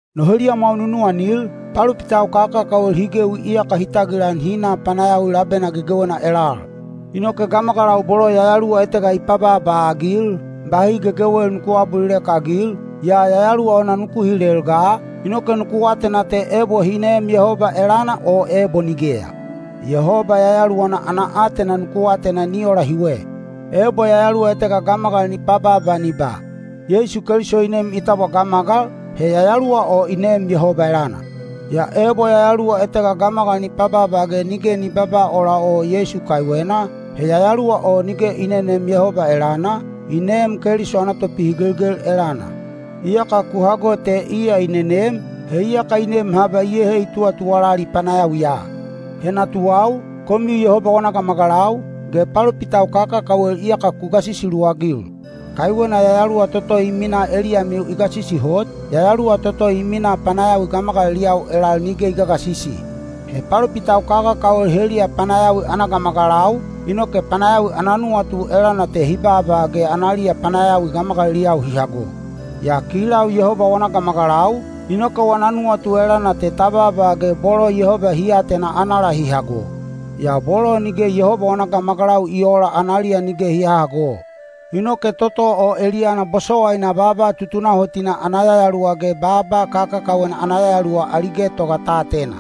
No heliyamwau nunuwanil, palopitau kakakawel hi gewi iyaka hi tagilan hi na panayawi labena gegewena elal. Inoke gamagalau bolo yayaluwa etega i pabaaba-agil, bahi gegewel nuku aabulilek-agil, yaa yayaluwa ona nuku hilel ga, inoke nuku atena te ebo hi neem Yehoba elana o ebo nigeya. Yehoba Yayaluwana ana aatena nuku atena ni ola hiwe. Ebo yayaluwa etega gamagal ni pabaaba ni ba, “Yeisu Keliso i nem i tabwa gamagal,” he Yayaluwa o i neem Yehoba elana. Yaa ebo yayaluwa etega gamagal ni pabaaba ge nige ni babaa ola o Yeisu kaiwena, he yayaluwa o nige i neneem Yehoba elana, i neem Keliso ana Topihigelgel elana. Iyaka ku hago te iya i nenem, he iyaka i nem haba iyehe i tuwatuwalali panayawiya. He natuwau, komiu Yehoba wana gamagalau, ge palopitau kakakawel iyaka ku gasisi luwagil. Kaiwena Yayaluwa toto i minaa eliyamiu i gasisi hot, yayaluwa toto i minaa panayawi gamagaliliyau elal nige i gagasisi. He palopitau kakakawel heliya panayawi ana gamagalau, inoke panayawi ana nuwatu elana te hi baaba ge analiya panayawi gamagaliliyau hi hago. Yaa kilau Yehoba wana gamagalau, inoke wana nuwatu elana te ta baaba ge bolo Yehoba hi atena anala hi hago. Yaa bolo nige Yehoba wana gamagalau i oola anala nige hi hahago. Inoke toto o eliyana bosowaina baaba tutunahotina ana Yayaluwa ge baaba kakakawena ana yayaluwa ali getoga ta atena.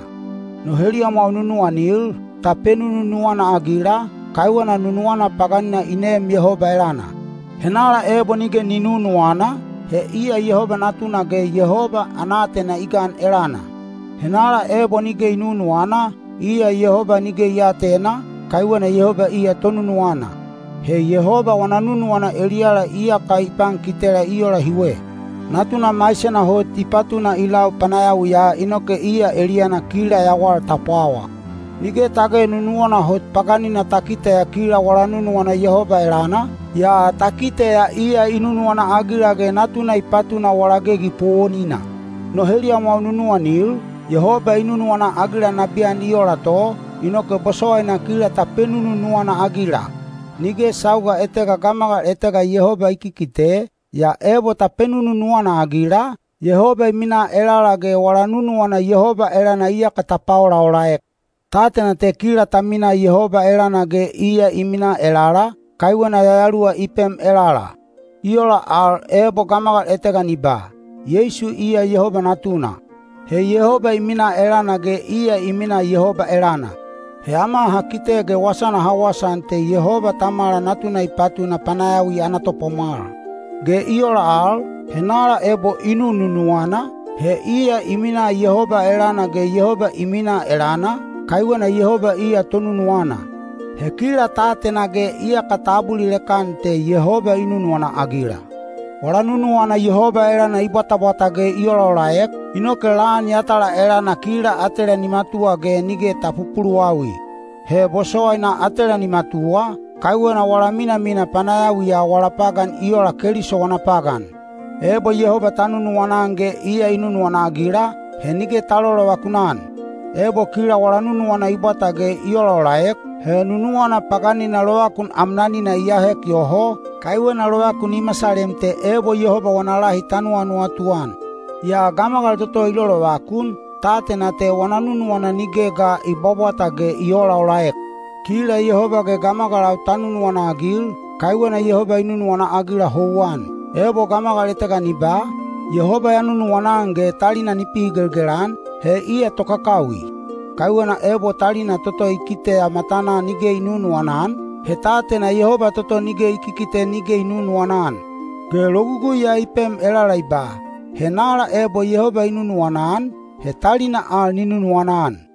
No heliyamwau nunuwanil, ta penununuwana-agila, kaiwena nunuwana paganina i neem Yehoba elana. Henala ebo i nunuwana, he iya Yehoba natuna ge Yehoba ana aatena i gan elana. Henala ebo nige ni nunuwana, iya Yehoba nige i aatena, kaiwena Yehoba iya tonunuwana. He Yehoba wana nunuwana eliyala iyaka i pankitela i ola hiwe: Natuna maisena hot i patuna i lau panayawiya inoke iya eliyana kila yawal ta pwawa. Nige tage nunuwana hot paganina ta kiteya kila wala nunuwana Yehoba elana, yaa ta kiteya iya i nunuwana-agila ge Natuna i patuna wala gegi powonina. No heliyamwau nunuwanil, Yehoba i nunuwana-agila nabiyan i ola to, inoke bosowaina kila ta penununuwana-agila. Nige sauga etega gamagal etega Yehoba i kikite, yaa ebo ta penununuwana-agila, Yehoba i minaa elala ge wala nunuwana Yehoba elana iyaka ta paolaolaek. Ta atena te kila ta minaa Yehoba elana ge iya i minaa elala, kaiwena Yayaluwana i pem elala. I ola al, ebo gamagal etega ni ba, “Yeisu iya Yehoba Natuna,” he Yehoba i minaa elana ge iya i minaa Yehoba elana. (He ama ha kite ge wasana ha wasaan te Yehoba Tamala Natuna i patuna panayawi ana Topwamwal.) Ge i ola al, henala ebo i nununuwana, he iya i minaa Yehoba elana ge Yehoba i minaa elana, kaiwena Yehoba iya tonunuwana. He kila ta atena ge iyaka ta abulilek-an te Yehoba i nunuwana-agila. Wala nunuwana Yehoba elana i bwatabwata ge i olaolaek, inoke lan yatala elana kila atela ni matuwa ge nige ta pupuluwawi. He bosowaina atela ni matuwa, kaiwena wala minamina panayawiya wala pagan i ola Keliso wana pagan. Ebo Yehoba ta nunuwana-an ge iya i nunuwana-agila, he nige ta lolovakun-an. Ebo kila wala nunuwana i bwata ge i olaolaek, he nunuwana paganina lovakun amnanina i ahek yoho, kaiwena lovakun i masalem te ebo Yehoba wana lahi ta nuwanuwatu an. Yaa gamagal toto i lolovakun, ta atena te wana nunuwana nige ga i bwabwata ge i oolaolaek. Kila Yehoba ge gamagalau ta nunuwana-agil, kaiwena Yehoba i nunuwana-agila houwan. Ebo gamagal etega ni ba, “Yehoba ya nunuwana-an” ge talina i pihigelgel-an, he iya tokakawi. Kaiwena ebo talina toto i kiteya matanaa nige i nunuwana-an, he ta atena Yehoba toto nige i kikite nige i nunuwana-an. Ge logugui ya i pem elala i ba, “Henala ebo Yehoba i nunuwana-an, he talina al ni nunuwana-an.”